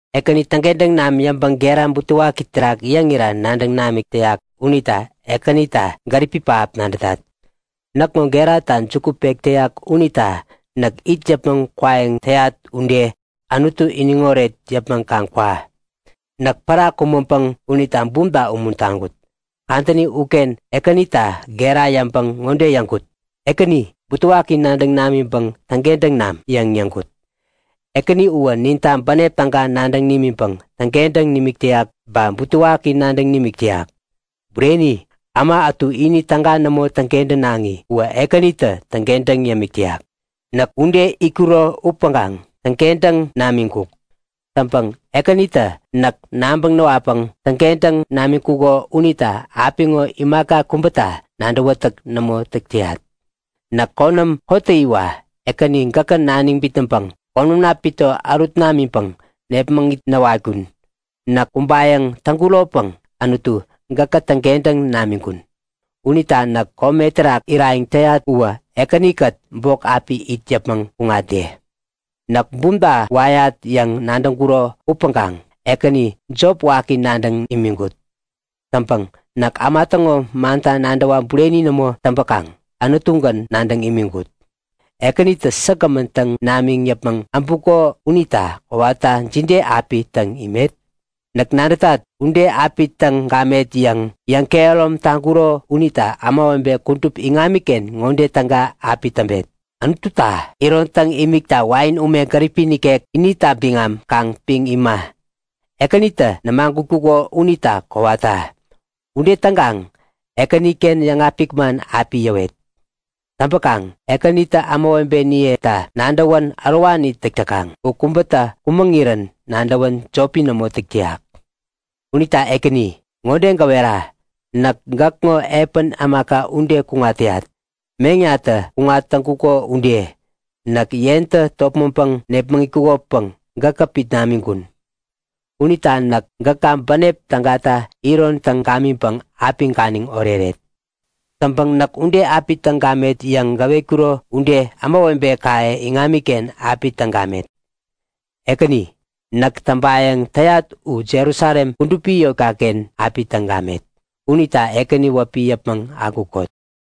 Ekäni täŋkentäŋ nam yäŋpäŋ gera butewaki terak yäŋira nadäŋ namik täyak unita Ekänita gäripi pähap nadätat. Näkŋo gerata juku pek täyak unita näk it yäpmäŋ kwayäŋ täyat ude Anutu iniŋoret yäpmäŋ kaŋ kwa. Näk pära kumäŋpäŋ unita bumta umuntaŋkut. Kadäni uken Ekänita gera yäŋpäŋ ŋode yäŋkut; Ekäni, butewaki nadäŋ namiŋpäŋ täŋkentäŋ nam! yäŋ yäŋkut. Ekäni uwä ninta bänep täga nadäŋ nimiŋpäŋ täŋkentäŋ nimik täyak ba butewaki nadäŋ nimik täyak. Bureni! Äma ätu ini täga nämo täŋkentänaŋi uwä Ekänitä täŋkentäŋ yämik täyak. Näk ude itkuro upäŋkaŋ täŋkentäŋ namiŋkuk. Täŋpäŋ Ekänitä näk nabäŋ näwatpäŋ täŋkentäŋ namiŋkuko unita apiŋo imaka kubäta nadäwätäk nämo täk täyat. Näk konäm kottäyiwa Ekäni gäkä naniŋ bitnäŋpäŋ konämna pito ärut namiŋpäŋ nepmäŋit näwatkun. Näk kumbayäŋ täŋkuropäŋ Anutu gäkä täŋkentäŋ namiŋkun. Unita näk kome terak irayäŋ täyat uwä Ekänikät bok api it yäpmäŋ kuŋatde. Näk bumta wayat yäŋ nadäŋkuro upäŋkaŋ Ekäni jop waki nadäŋ imiŋkut. Täŋpäŋ näk äma täŋo manta nadäwa bureni nämo täŋpäkaŋ Anutugän nadäŋ imiŋkut. Ekänitä säkgämän täŋ namiŋ yäpmäŋ äbuko unita kowata jide api täŋ imet? Näk nadätat! Ude api täŋ gamet yäŋ yäŋkehärom taŋkuro unita ämawebe kudup iŋamiken ŋode täga api täŋpet; Anututa iron imikta wain ume gäripi nikek inita biŋam kaŋ piŋ ima, Ekänitä nämagutkuko unita kowata. Ude täŋkaŋ Ekäniken yäŋapik man api yäwet. Täŋpäkaŋ Ekänitä ämawebeniyeta nadäwän ärowani täk täkaŋ. U kubätä kumäŋirän nadäwän jopi nämo täk täyak. Unita Ekäni, ŋode gäwera; Näk gäkŋo epän ämaka ude kuŋat täyat, meŋnatä kuŋat täŋkuko ude. Näk yentä topmäŋpäŋ nepmaŋkuŋopäŋ gäkä pit namiŋkun. Unita näk gäka bänep tägata iron täŋ gamiŋpäŋ api ganiŋ oreret. Täŋpäŋ näk ude api täŋ gamet yäŋ gäwetkuro ude ämawebekaye iŋamiken api täŋ gamet. Ekäni, näk täŋpayäŋ täyat u Jerusalem kudupi yotkaken api täŋ gamet. Unita Ekäni wäpi yäpmäŋ akukot!